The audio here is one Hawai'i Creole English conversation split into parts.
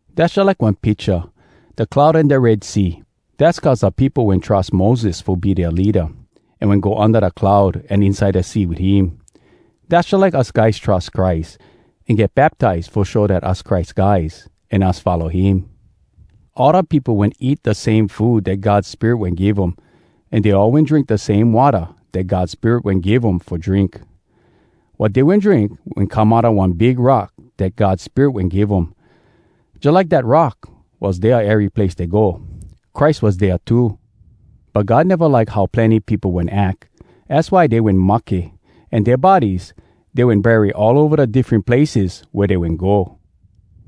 Dass jalike one picha, da cloud an da Red Sea. Dass cuz da peopo wen trus Moses fo be dea leada, an wen go unda da cloud an inside da sea wit him. Dass jalike us guys trus Christ, an get baptize fo show dat us Christ guys, an us follow him. All da peopo wen eat da same food dat God Spirit wen give um, an dey all wen drink da same watta dat God Spirit wen give um fo drink. Wat dey wen drink wen come outa one big rock dat God Spirit wen give um. Jalike dat rock was dea ery place dey go, Christ was dea too. But God neva like how plenny peopo wen ack. Az why dey wen mahke, an dea bodies dey wen bury all ova da diffren places wea dey wen go.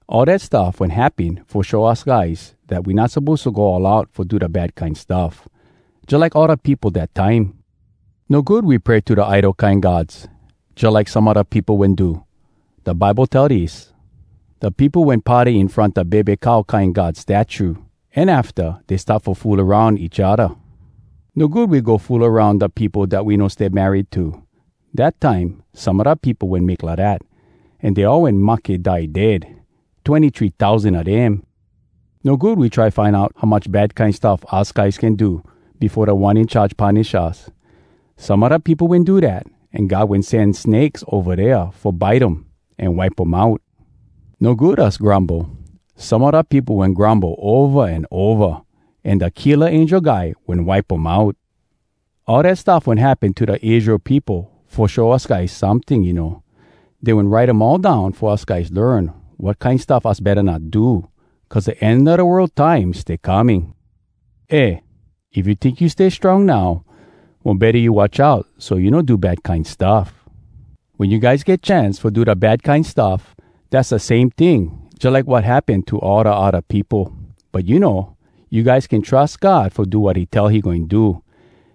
All dat stuff wen happen fo show us guys dat we not suppose to go all out fo do da bad kine stuff, jalike all da peopo dat time. No good we pray to da idol kine gods, jalike some a da peopo wen do. Da Bible tell dis: “Da peopo wen party in front da bebe cow kine god statue, an afta, dey start fo fool aroun each odda.” No good we go fool aroun da peopo dat we no stay married to. Dat time, some a da peopo wen make lidat, an dey all wen mahke die dead, twenny-three tousan a dem. No good we try find out how much bad kine stuff us guys can do befo Da One In Charge punish us. Some a da peopo wen do dat, an God wen sen snakes ova dea fo bite um an wipe um out. No good us grumble. Some a da peopo wen grumble ova an ova, an da Killa Angel Guy wen wipe um out. All dat stuff wen happen to da Israel peopo fo show us guys someting, you know. Dey wen write um all down fo us guys learn wat kine stuff us betta not do, cuz da end a da world time stay coming! Eh! If You tink you stay strong now, mo betta you watch out so you no do bad kine stuff. Wen you guys get chance fo do da bad kine stuff, dass da same ting, jalike wat happen to all da odda peopo. But you know, you guys can trus God fo do wat he tell he goin do.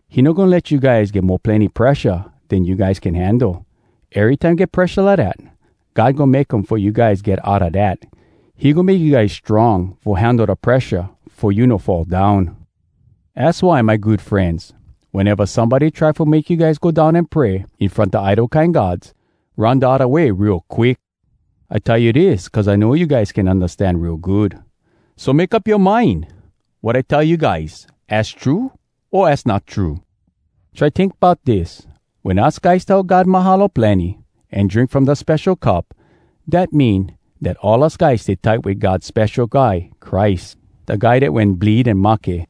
He no goin let you guys get mo plenny presha den you guys can handle. Erytime get presha lidat, God goin make um fo you guys get outa dat. He goin make you guys strong fo handle da presha fo you no fall down. Az why, my good frenz, weneva somebody try fo make you guys go down an pray in front da idol kine gods, run da odda way real quick! I tell you dis cuz I know you guys can undastan real good. So make up yoa mind! Wat I tell you guys, az true o az not true?! Try tink bout dis: wen us guys tell God “Mahalo plenny!” an drink from da spesho cup—dat mean, dat all us guys stay tight wit God Spesho Guy Christ, da guy dat wen bleed an mahke.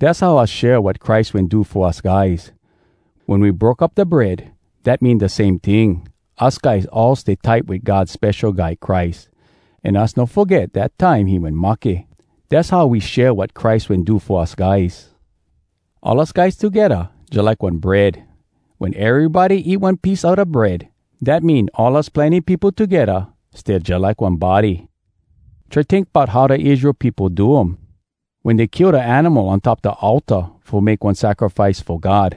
Dass how us share wat Christ wen do fo us guys. Wen we broke up da bread, dat mean da same ting—us guys all stay tight wit God Spesho Guy Christ, an us no foget dat time he wen mahke. Dass how we share wat Christ wen do fo us guys. All us guys togedda jalike one bread. Wen erybody eat one piece a da bread, dat mean all us plenny peopo togedda stay jalike one body. Try tink bout how da Israel peopo do um: wen dey kill da animal on top da altar fo make one sacrifice fo God,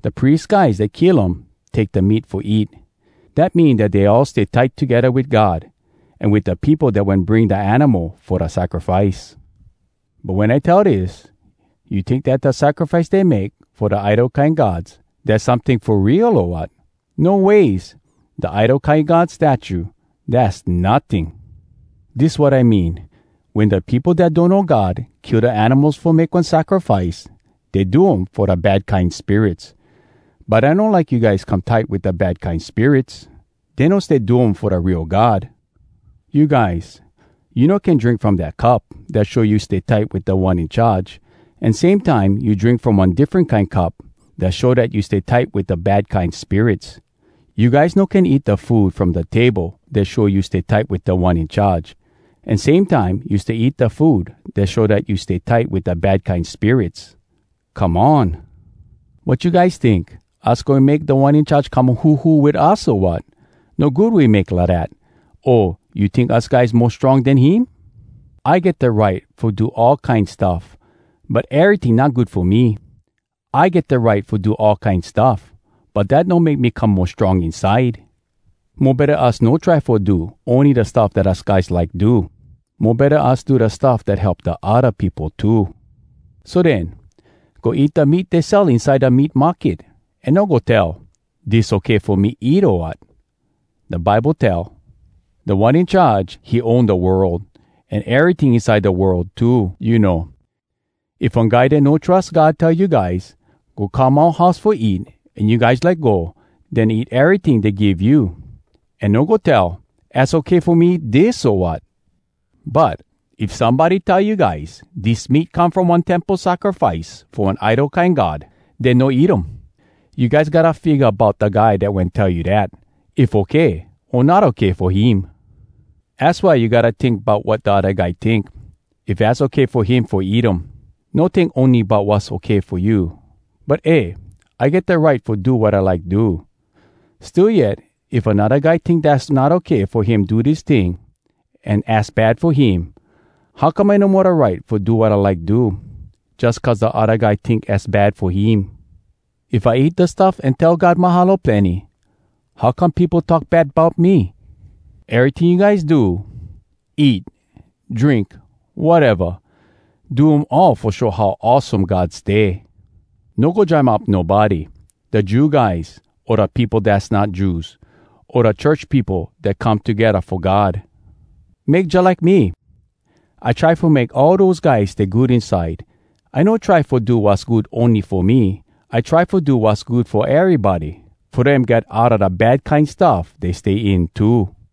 da pries guys dat kill um take da meat fo eat. Dat mean dat dey all stay tight togedda wit God an wit da peopo dat wen bring da animal fo da sacrifice. But wen I tell dis, you tink dat da sacrifice dey make fo da idol kine gods, dass someting fo real, o wat? No ways! Da idol kine god statue, dass notting! Dis wat I mean: wen da peopo dat donno God kill da animals fo make one sacrifice, dey do um fo da bad kine spirits. But I no like you guys come tight wit da bad kine spirits! Dey no stay do um fo da real God. You guys, you no can drink from da cup dat show you stay tight wit Da One In Charge, an same time, you drink from one diffren kine cup dat show dat you stay tight wit da bad kine spirits. You guys no can eat da food from da table dat show you stay tight wit Da One In Charge, an same time, you stay eat da food dat show dat you stay tight wit da bad kine spirits. Come on! Wat you guys tink? Us goin make Da One In Charge come huhu wit us, o wat? No good we make lidat. O, you tink us guys mo strong den him? I get da right fo do all kine stuff, but eryting not good fo me. I get da right fo do all kine stuff, but dat no make me come mo strong inside. Mo betta us no try fo do ony da stuff dat us guys like do. Mo betta us do da stuff dat help da odda peopo too. So den, go eat da meat dey sell inside da meat market, an no go tell, “Dis okay fo me eat, o wat?” Da Bible tell, “Da One In Charge, he own da world, an eryting inside da world too,” you know. If one guy dat no trus God tell you guys, “Go come oua house fo eat!” an you guys like go, den eat eryting dey give you, an no go tell, “Az okay fo me eat dis, o wat?” But, if somebody tell you guys, “Dis meat come from one temple sacrifice fo one idol kine god,” den no eat um. You guys gotta figga bout da guy dat wen tell you dat, if okay o not okay fo him. Az why you gotta tink bout wat da odda guy tink, if az okay fo him fo eat um. No tink ony bout wass okay fo you. But eh! I get da right fo do wat I like do. Still yet, if anodda guy tink dass not okay fo him do dis ting, an az bad fo him, how come I no mo da right fo do wat I like do, jus cuz da odda guy tink az bad fo him? If I eat da stuff an tell God “Mahalo plenny!” how come peopo talk bad bout me? Eryting you guys do, eat, drink, wateva—do um all fo show how awesome God stay. No go jam up nobody—da Jew guys, o da peopo dass not Jews, o da church peopo dat come togedda fo God. Make jalike me: I try fo make all dose guys stay good inside. I no try fo do wass good ony fo me. I try fo do wass good fo erybody, fo dem get outa da bad kine stuff dey stay in too.